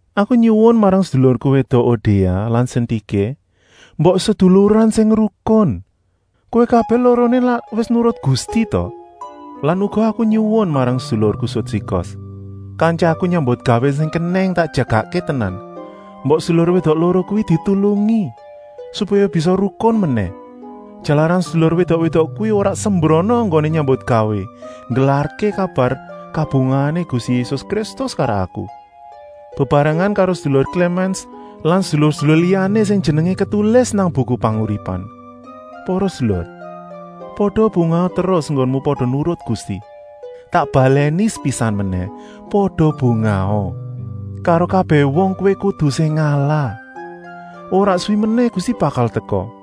Aku nyuwun marang sedulurku wédok Odia lan Sintiké, mbok seduluran sing rukun. Kowé kabèh loroné lak wis nurut Gusti ta? Lan aku uga nyuwun marang sedulurku Sudsigos, kantyaku nyambutgawé sing kenèng tak jagakké tenan, mbok sedulur wédok loro kuwi ditulungi, supaya bisa rukun menèh, jalaran sedulur wédok-wédok kuwi ora sembrana enggoné nyambutgawé nggelarké kabar kabungahané Gusti Yésus Kristus karo aku, bebarengan karo sedulur Klémens lan sedulur-sedulur liyané sing jenengé ketulis nang Buku Panguripan. Para sedulur, pada bungaha terus enggonmu pada nurut Gusti! Tak balèni sepisan menèh: pada bungaha! Karo kabèh wong kowé kudu sing ngalah. Ora suwi menèh Gusti bakal teka.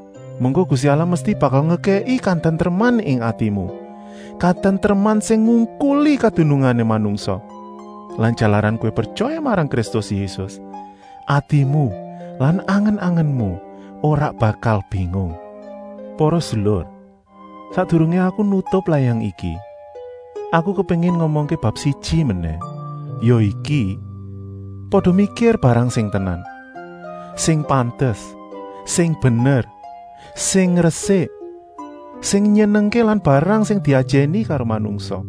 Mengko Gusti Allah mesti bakal ngekèki katentreman ing atimu, katentreman sing ngungkuli kadunungané manungsa. Lan jalaran kowé pretyaya marang Kristus Yésus, atimu lan angen-angenmu ora bakal bingung. Para sedulur, sakdurungé aku nutup layang iki, aku kepéngin ngomongké bab siji menèh, ya iki: pada mikir barang sing tenan, sing pantes, sing bener, sing resik, sing nyenengké lan barang sing diajèni karo manungsa.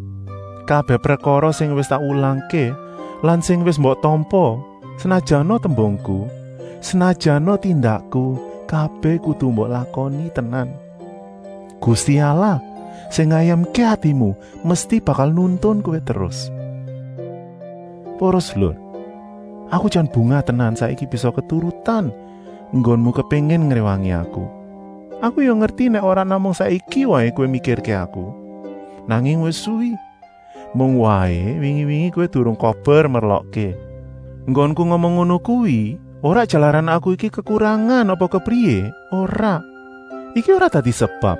Kabèh prekara sing wis tak wulangké lan sing wis mbok tampa, senajana tembungku, senajana tindakku, kabèh kudu mbok lakoni tenan. Gusti Allah, sing ngayemké atimu, mesti bakal nuntun kowé terus. Para sedulur, aku jan bungah tenan saiki bisa keturutan enggonmu kepéngin ngréwangi aku. Aku ya ngerti nèk ora namung saiki waé kowé mikirké aku, nanging wis suwi, mung waé wingi-wingi kowé durung kober merlokké. Enggonku ngomong ngono kuwi ora jalaran aku iki kekurangan apa kepriyé, ora. Iku ora dadi sebab,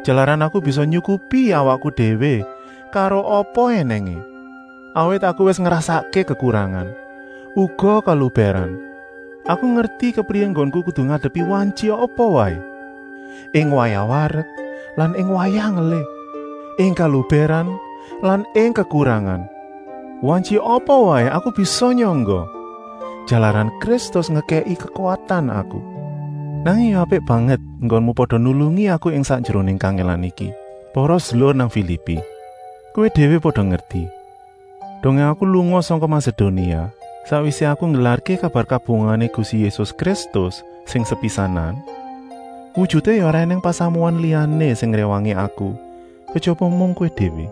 jalaran aku bisa nyukupi awakku déwé karo apa ènèngé. Awit aku wis ngrasakké kekurangan, uga kelubèran. Aku ngerti kepriyé enggonku kudu ngadepi situasi apa waé, ing wayah warek lan ing wayah ngelih, ing kelubèran lan ing kekurangan. Situasi apa waé aku bisa nyangga, jalaran Kristus ngekèki kekuwatan aku. Nanging ya apik banget enggonmu pada nulungi aku ing sakjeroné kangèlan iki. Para sedulur nang Filipi, kowé déwé pada ngerti, dongé aku lunga sangka Masedonia, sakwisé aku nggelarké kabar kabungahané Gusti Yésus Kristus sing sepisanan, wujuté ya ora ènèng pasamuan liyané sing ngréwangi aku kejaba mung kowé déwé.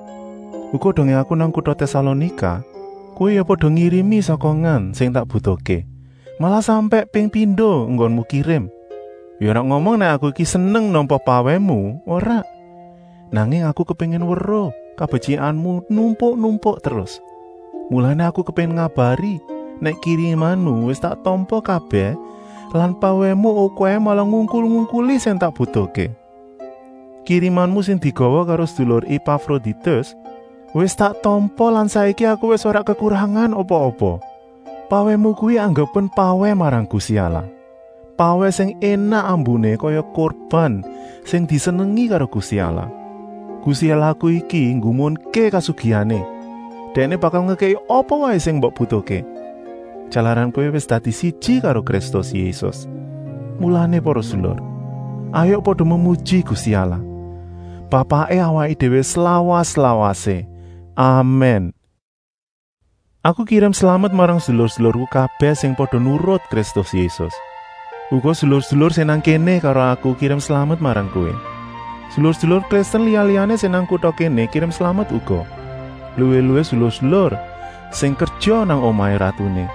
Uga dongé aku nang kuta Tèsalonika kowé ya pada ngirimi sokongan sing tak butuhké, malah sampèk ping pindo enggonmu kirim. Ya ora ngomong nèk aku iki seneng nampa pawèhmu, ora, nanging aku kepéngin weruh kabetyikanmu numpuk-numpuk terus. Mulané aku kepéngin ngabari nèk kirimanmu wis tak tampa kabèh lan pawèhmu okèhé malah ngungkul-ungkuli sing tak butuhké. Kirimanmu sing digawa karo sedulur Epafroditus wis tak tampa lan saiki aku wis ora kekurangan apa-apa. Pawèhmu kuwi anggepen pawèh marang Gusti Allah, pawèh sing énak ambuné kaya kurban sing disenengi karo Gusti Allah. Gusti Allahku iki nggumunké kasugihané, Dèkné bakal ngekèki apa waé sing mbok butuhké, jalaran kowé wis dadi siji karo Kristus Yésus. Mulané para sedulur, hayuk pada memuji Gusti Allah, Bapaké awaké déwé slawas-lawasé! Amèn. Aku kirim slamet marang sedulur-sedulurku kabèh sing pada nurut Kristus Yésus. Uga sedulur-sedulur sing nang kéné karo aku kirim slamet marang kowé. Sedulur-sedulur Kristen liya-liyané sing nang kuta kéné kirim slamet uga, luwih-luwih sedulur-sedulur sing kerja nang omahé ratuné.